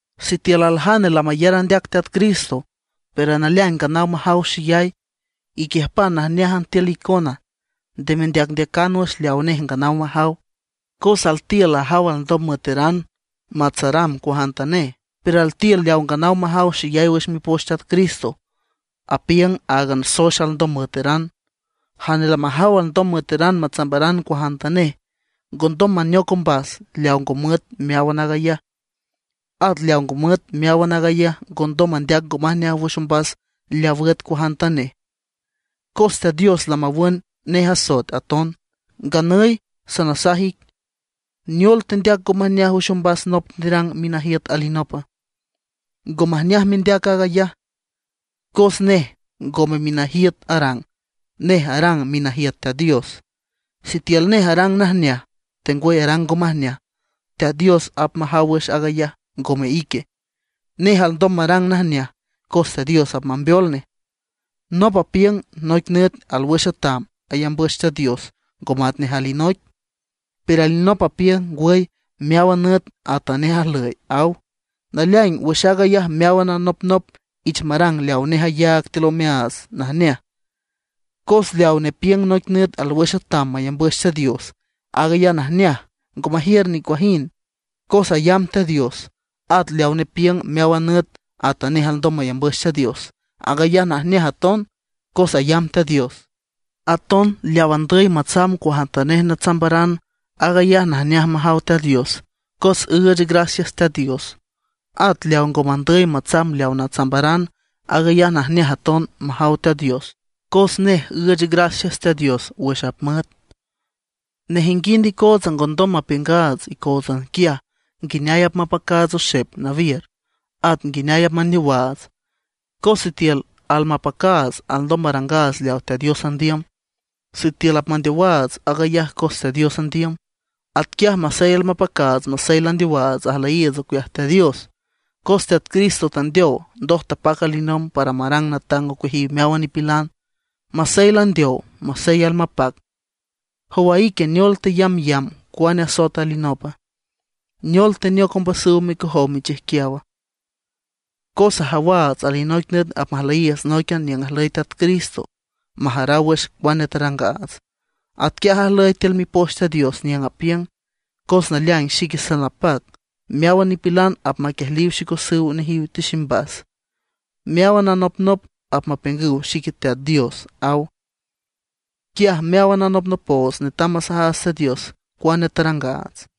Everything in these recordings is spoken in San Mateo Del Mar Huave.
Sitiül aljane lamayar andeac Teat Cristo, pero naleaing nganaw majaw xeyay, iquiüjpan najneájan tiül icona, nde mendeacndeacan wüx leaw nej nganaw majaw. Cos altiül ajaw alndom müeteran matsaramb cuajantanej, pero altiül leaw nganaw majaw xeyay wüx Mipoch Teat Cristo, apiüng áagan soex alndom müeteran. Jane lamajaw alndom müeteran matsaramb cuajantanej, ngondom maneoc ombas leaw ngo müet meáwan aag ayaj. At leaw ngo müet meáwan aag ayaj ngondom mandeac ngo majneaj wüx ombas leaw üet cuajantanej, cos Teat Dios lamawün nej asoet aton. Nganüy sanasaj ic, ¿neol tendeac ngo majneaj wüx ombas nop nerang minajiüt alinopa? Ngo majneaj mendeac aag ayaj, cos nej ngome minajiüt arang, nej arang minajiüt Teat Dios. Sitiül nej arang najneaj tengwüy arang ngo majneaj, Teat Dios apmajaw wüx aag ayaj, ngome ique. Nej alndom marang najneaj, cos Teat Dios apmambeol nej. Nop apiüng noic nüt alwüx atam mayambüch Teat Dios ngo matnej alinoic; pero alinop apiüng: Ngwüy, meáwan nüt atanej ajlüy, aw. Naleaing, wüx aag ayaj meáwan anopnop ich marang leaw nej ayaag tiül omeaats najneaj. Cos leaw nepiüng noic nüt alwüx atam mayambüch Teat Dios, aag ayaj najneaj, ngo majiür nicuajind, cos ayamb Teat Dios. At leaw nepiüng meáwan nüt atanej alndom mayambüch Teat Dios, aag ayaj najneaj aton, cos ayamb Teat Dios. Aton leawa andüy matsamb cuajantanej natsambaran, aag ayaj najneaj majaw Teat Dios, cos üüch gracias Teat Dios, at leaw ngo mandüy matsamb leaw natsambaran, aag ayaj najneaj aton majaw Teat Dios, cos nej üüch gracias Teat Dios wüx apmüet. Nejinguind icootsa ngondom mapiüngaats icóotsan quiaj nguineay apmapacaats oxep nawiür, at nguineay apmandeowaats. Cos sitiül almapacaats, alndom marangaats leawa Teat Dios andiüm; sitiül apmandeowaats, aag ayaj cos Teat Dios andiüm. Atquiaj masey almapacaats masey landeowaats ajlüyiiüts ocueaj Teat Dios. Cos Teat Cristo tandeow ndoj tapac alinomb para marang natang ocueajiw meáwan nipilan, masey landeow, masey almapac. ¿Jowa ique, neol teyambyamb cuane asoet alinopa? ¿Neol teneoc ombasüw micojow michijquiawa? Cos ajawaats alinoic nüt apmajlüyiiüts nóiquian niüng ajlüy Teat Cristo, majaraw wüx cuane tarangaats. Atquiaj ajlüy tiül Mipoch Teat Dios, niüng apiüng: Cos naleaing xique salnapac, meáwan nipilan apmaquiejliw micosüw nejiw tiximbas. Meáwan anopnop apmapiüngüw xique Teat Dios, aw. Quiaj meáwan anopnopoots netam masajaats Teat Dios cuane tarangaats.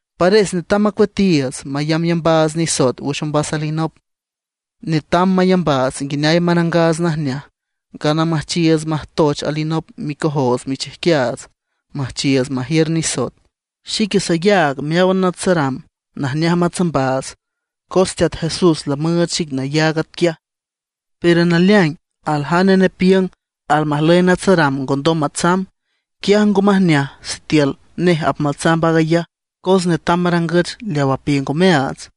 Pares netam macueatiiüts mayambyambaats nisoet wüx ombas nop alinop. Netam mayambaats nguineay marangaats najneaj, ngana müjchiiüts majtoch alinop micojoots michijquiaats, müjchiiüts majiür nisoet. Xique sayaag meáwan natsaramb najneaj matsambaats, cos Teat Jesús lamüüch xic nayaag atquiaj. Pero naleaing, aljane nepiüng almajlüy natsaramb ngondom matsamb, quiaj ngo majneaj sitiül nej apmatsamb aag ayaj, cos netam marangüch leaw apiüng omeaats.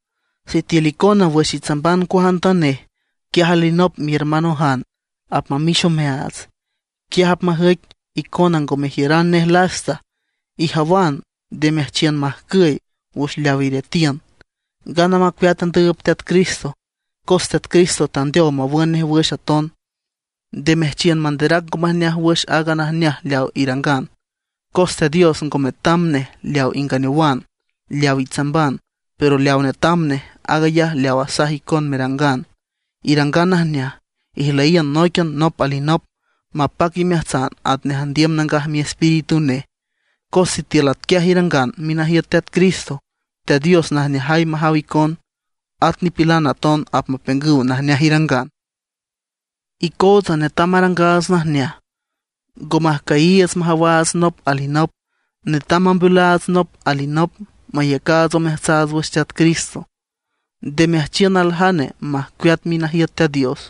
Sitiül icona wüx itsamban cuajantanej, quiaj alinop mihermanojan apmamix omeaats, quiaj apmajüic icona ngo mejiüran nej lasta. Ijawan, nde meajchiün majcüy wüx leaw iretiün, ngana macueat andüüb Teat Cristo, cos Teat Cristo tandeow mawün nej wüx aton. Nde meajchiün manderac ngo majneaj wüx aaga najneaj leaw irangan. Cos Teat Dios ngo metam nej leaw inganeowan, leaw itsamban; pero leaw netam nej, aag ayaj leawa asaj icon merangan. Irangan najneaj, ijlüyiün nóiquian nop alinop, mapac imeajtsan atnej andiüm Nangaj Miespíritu nej. Cos sitiül atquiaj irangan minajiüt Teat Cristo, Teat Dios najneajay majaw icon, at nipilan aton apmapiüngüw najneaj irangan. Icootsa netam marangaats najneaj, ngo majcüyiiüts majawaats nop alinop; netam mambeolaats nop alinop mayacaats omeajtsaats wüx Teat Cristo. Nde meajchiün aljane majcueat minajiüt Teat Dios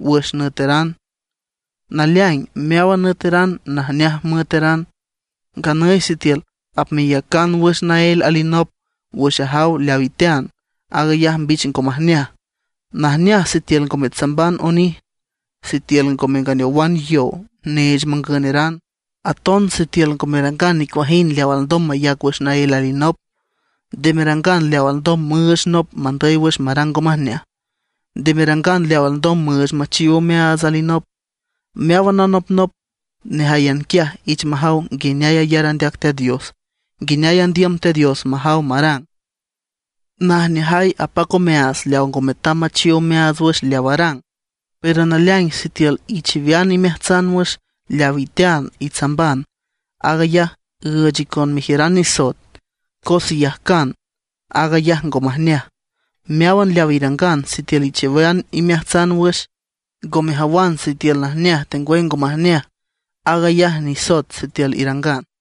wüx nüetaran. Naleaing meáwan nüetaran najneaj müeteran. Nganüy sitiül apmeyacan wüx naél alinop wüx ajaw leaw itean, aag ayaj mbich ngo majneaj. Najneaj sitiül ngo metsamban onij, sitiül ngo menganeowan yow neech mangüneran, aton sitiül ngo merangan nicuajind leaw alndom mayac wüx naél alinop. Nde merangan leaw alndom müüch nop mandüy wüx marang ngo majneaj. Nde merangan leaw alndom müüch machiw omeaats alinop. Meáwan anopnop nejáyan quiaj ich majaw nguineay ayar andeac Teat Dios, nguineay andiüm Teat Dios majaw marang. Najneajay apac omeaats leaw ngo metam machiw omeaats wüx leaw arang. Pero naleaing sitiül ichiwean imeajtsan wüx leaw itean itsamban, aag ayaj üüch icon mejiüran nisoet, cos iyajcan aag ayaj ngo majneaj. Meáwan leaw irangan sitiül ichiwean imeajtsan wüx, ngo mejawan sitiül najneaj tengwüy ngo majneaj, aag ayaj nisoet sitiül irangan.